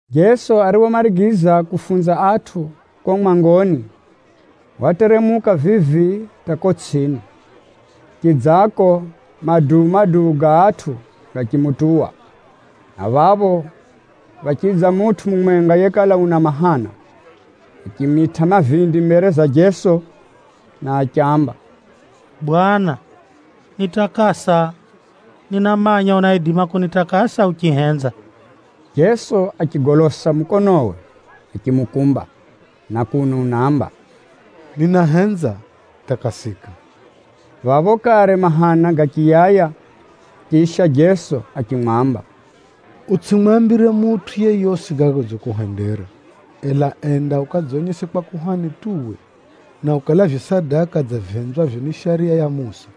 Jeso ariphomarigiza kufunza atʼu kuko mwangoni, wateremuka vivi hata kuko tsʼini. Chidzako maduu-maduu ga atʼu gachimutuwa, na phapho phachidza mutʼu mumwenga yekala una mahana. Achimitʼa mavindi mbere za Jeso na achiamba, “Bwana, nitakasa! Ninamanya unaidima kunitakasa uchihenza.” Jeso achigolosa mukonowe achimukumba, na kuno unaamba, “Ninahenza, takasika!” Phapho kare mahana gachiyaya. Chisha Jeso achimwamba, “Utsʼimwambire mutʼu yeyosi gaga godzikuhendera. Ela enda ukadzonyese kwa kuhani tu uwe, na ukalavye sadaka dza vihenzwavyo ni Shariya ya Musa,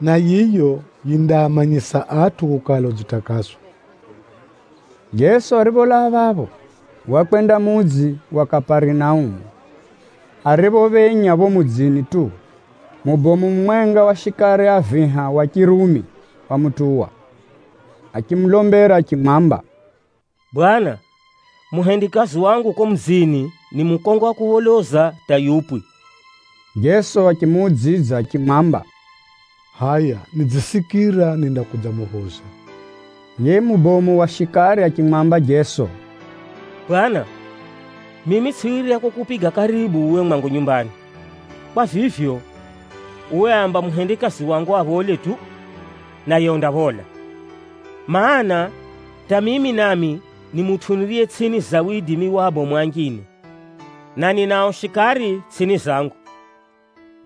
na yiyo yindaamanyisa atʼu kukala udzitakaswa.” Jeso aripholaa phapho, wakwenda mudzi wa Kaparinaumu. Ariphophenya phapho mudzini tu, mubomu mumwenga wa shikari a viha wa Chirumi wamutuwa, achimulombera achimwamba, “Bwana, muhendikazi wangu kuko mudzini ni mukongo wa kupholoza hata yupwi.” Jeso achimuudzidza achimwamba, “Hʼaya nidzisikira nindakudzamuphoza.” Yiye mubomu wa shikari achimwamba Jeso, “Bwana, mimi tsʼiwirya kukupiga karibu uwe mwangu nyumbani. Kwa vivyo, uwe amba muhendikazi wangu aphole tu, naye undaphola. Maana, hata mimi nami ni mutʼu niriye tsʼini za widimi wa abomu anjine, na ninao shikari tsʼini zangu.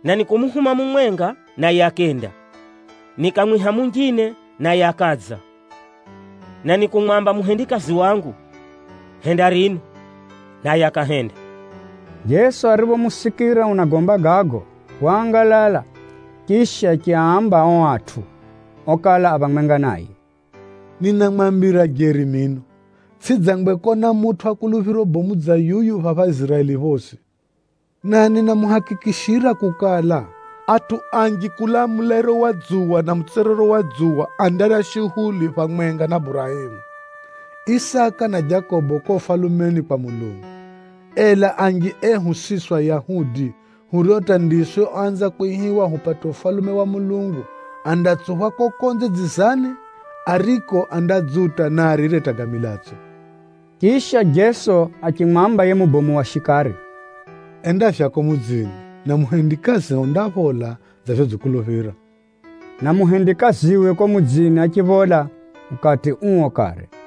Na nikumuhuma mumwenga, naye akenda. Nikamwiha munjine, naye akadza, na nikumwamba muhendikazi wangu, ‘Henda rino,’ naye akahenda.” Jeso ariphomusikira unagomba gago, waangalala, chisha achiaamba ao atʼu okala a phamwenga naye, “Ninamwambira jeri mino, tsʼidzangwe kona mutʼu wa kuluphiro bomu dza yuyu phapha Iziraeli phosi! Na ninamuhakikishira kukala, atʼu anji kulaa mulairo wa dzuwa na mutswerero wa dzuwa andarya shuhuli phamwenga na Burahemu, Isaka na Jakobo kuko Ufalumeni kwa Mulungu. Ela anji ehu siswi Ayahudi, hurio hata ndiswi oanza kwihiwa hupate Ufalume wa Mulungu, andatsuphwa kuko konze dzizani, ariko andadzuta na arire hata ga milatso.” Chisha, Jeso achimwamba yiye mubomu wa shikari, “Enda vyako mudzini, na muhumikio undaphola dza vyodzikuluphira.” Na muhendikaziwe kuko mudzini achiphola ukati uo kare.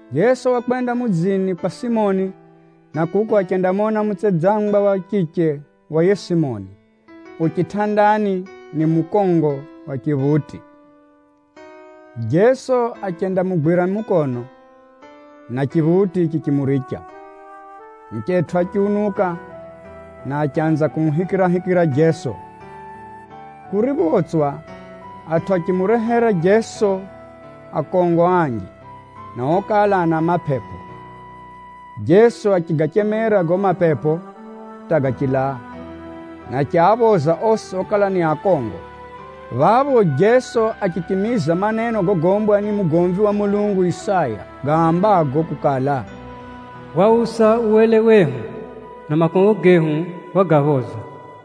Jeso wakwenda mudzini kwa Pʼetero, na kuko achendamona mutsedzangwa wa chiche wa yiye Pʼetero yu chitʼandani ni mukongo wa chiphuti. Jeso achendamugwira mukono, na chiphuti chichimuricha. Muchetʼu achiunuka, na achanza kumuhikirahikira Jeso. Kuriphotswa, atʼu achimurehera Jeso akongo anji, na okala ana mapepo. Jeso achigachemera gago mapepo hata gachilaa, na achiaphoza osi okala ni akongo. Phapho Jeso achichimiza maneno gogombwa ni mugomvi wa Mulungu Isaya, gaambago kukala, “Wausa uwele wehu, na makongo gehu wagaphoza.”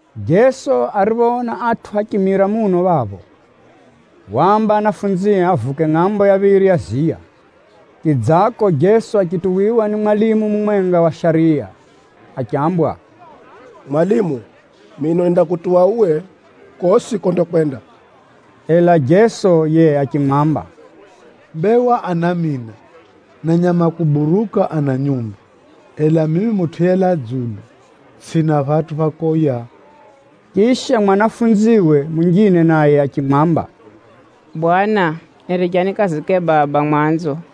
Jeso ariphoona atʼu achimira muno phapho, waamba anafunzie avuke ngʼambo ya phiri ya ziya. Chidzako, Jeso achituwiwa ni mwalimu mumwenga wa shariya achambwa, “Mwalimu, mino nindakutuwa uwe kosi kondakwenda.” Ela Jeso yiye achimwamba, “Mbewa ana mina, na nyama a kuburuka ana nyumba, ela mimi Mutʼu yelaa dzulu tsʼina phatʼu pha kwika mbavu.” Chisha, mwanafunziwe munjine naye achimwamba, “Bwana, niricha nikazike baba mwanzo, ndo nidze nikutuwe.”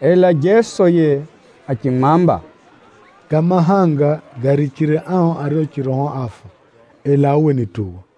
Ela Jeso yiye achimwamba, “Ga mahanga garichire ao ario chiroho áfa, ela uwe nituwa.”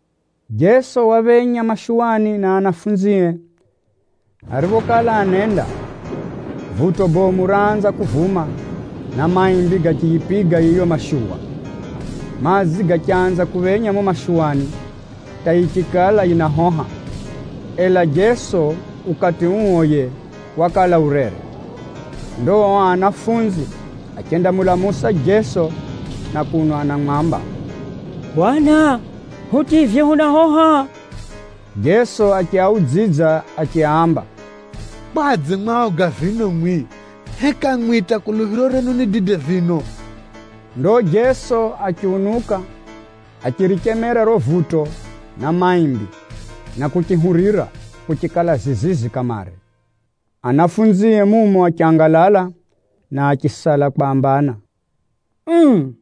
Jeso waphenya mashuwani na anafunzie. Ariphokala anenda, vuto bomu raanza kuvuma, na maimbi gachiyipiga yiyo mashuwa. Madzi gachanza kuphenya mumo mashuwani hata yichikala yinahoha, ela Jeso ukati uo yiye wakala urere. Ndo ao anafunzi achendamulamusa Jeso na kuno anamwamba, “Bwana, hutivye hunahoha!” Jeso achiaudzidza achiaamba, “Kwadze mu aoga vino mwimwi? Heka mwimwi hata kuluphiro renu ni dide vino?” Ndo Jeso achiunuka, achirichemera riro vuto na maimbi, na kuchihurira, kuchikala zizizi kamare. Anafunzie mumo achangalala, na achisala kwambana, “Uu!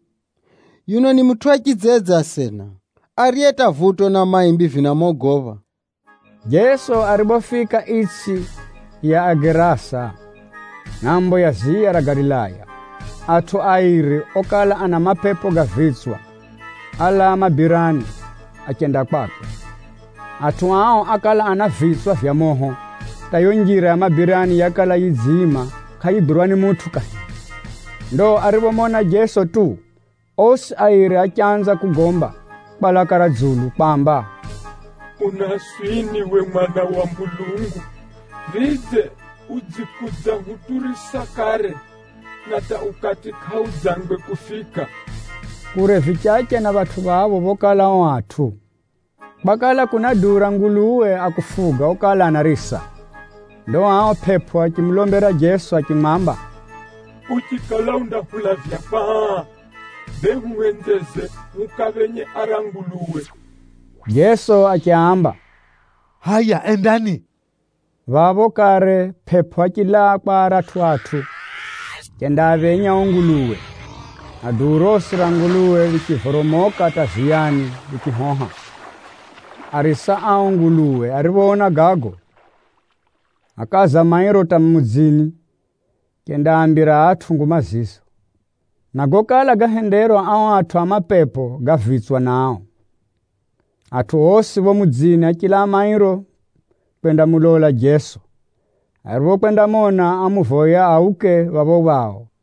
Yuno ni mutʼu wa chidzedze asena, ariye hata vuto na maimbi vinamogopha?” Jeso ariphofika itsʼi ya Agerasa, ngʼambo ya ziya ra Galilaya, atʼu airi okala ana mapepo ga vitswa álaa mabirani achenda kwakwe. Atʼu ao ákala ana vitswa vya moho hata yiyo njira ya mabirani yakala yidziima kʼayigwirwa ni mutʼu kahiri. Ndo ariphomona Jeso tu, osi airi achanza kugomba kwa laka ra dzulu kwamba, “Unaswini uwe Mwana wa Mulungu? Vidze, udzikudzahuturisa kare, na hata ukati kʼaudzangwe kufika?” Kure vichache na phatʼu phapho phokala ao atʼu, kwakala kuna duu bomu ra nguluwe a kufuga okala anarisa. Ndo ao pʼepʼo achimulombera Jeso achimwamba, “Uchikala undahulavya kwa aa, bee huhenzeze hukaaphenye ara nguluwe.” Jeso achiaamba, “Hʼaya endani!” Phapho kare pʼepʼo achilaa kwa aratʼu atʼu, achendaaphenya ao nguluwe, na duu rosi ra nguluwe richivoromoka hata ziyani richihoha. Arisa a ao nguluwe ariphoona gago, ákaza mairo hata mudzini achendaambira atʼu nguma zizo, na gokala gahenderwa ao atʼu a mapepo ga vitswa nao. Atʼu osi phapho mudzini achilaa mairo kwendamulola Jeso. Ariphokwendamona, ámuvoya auke phapho jimbo ra phao.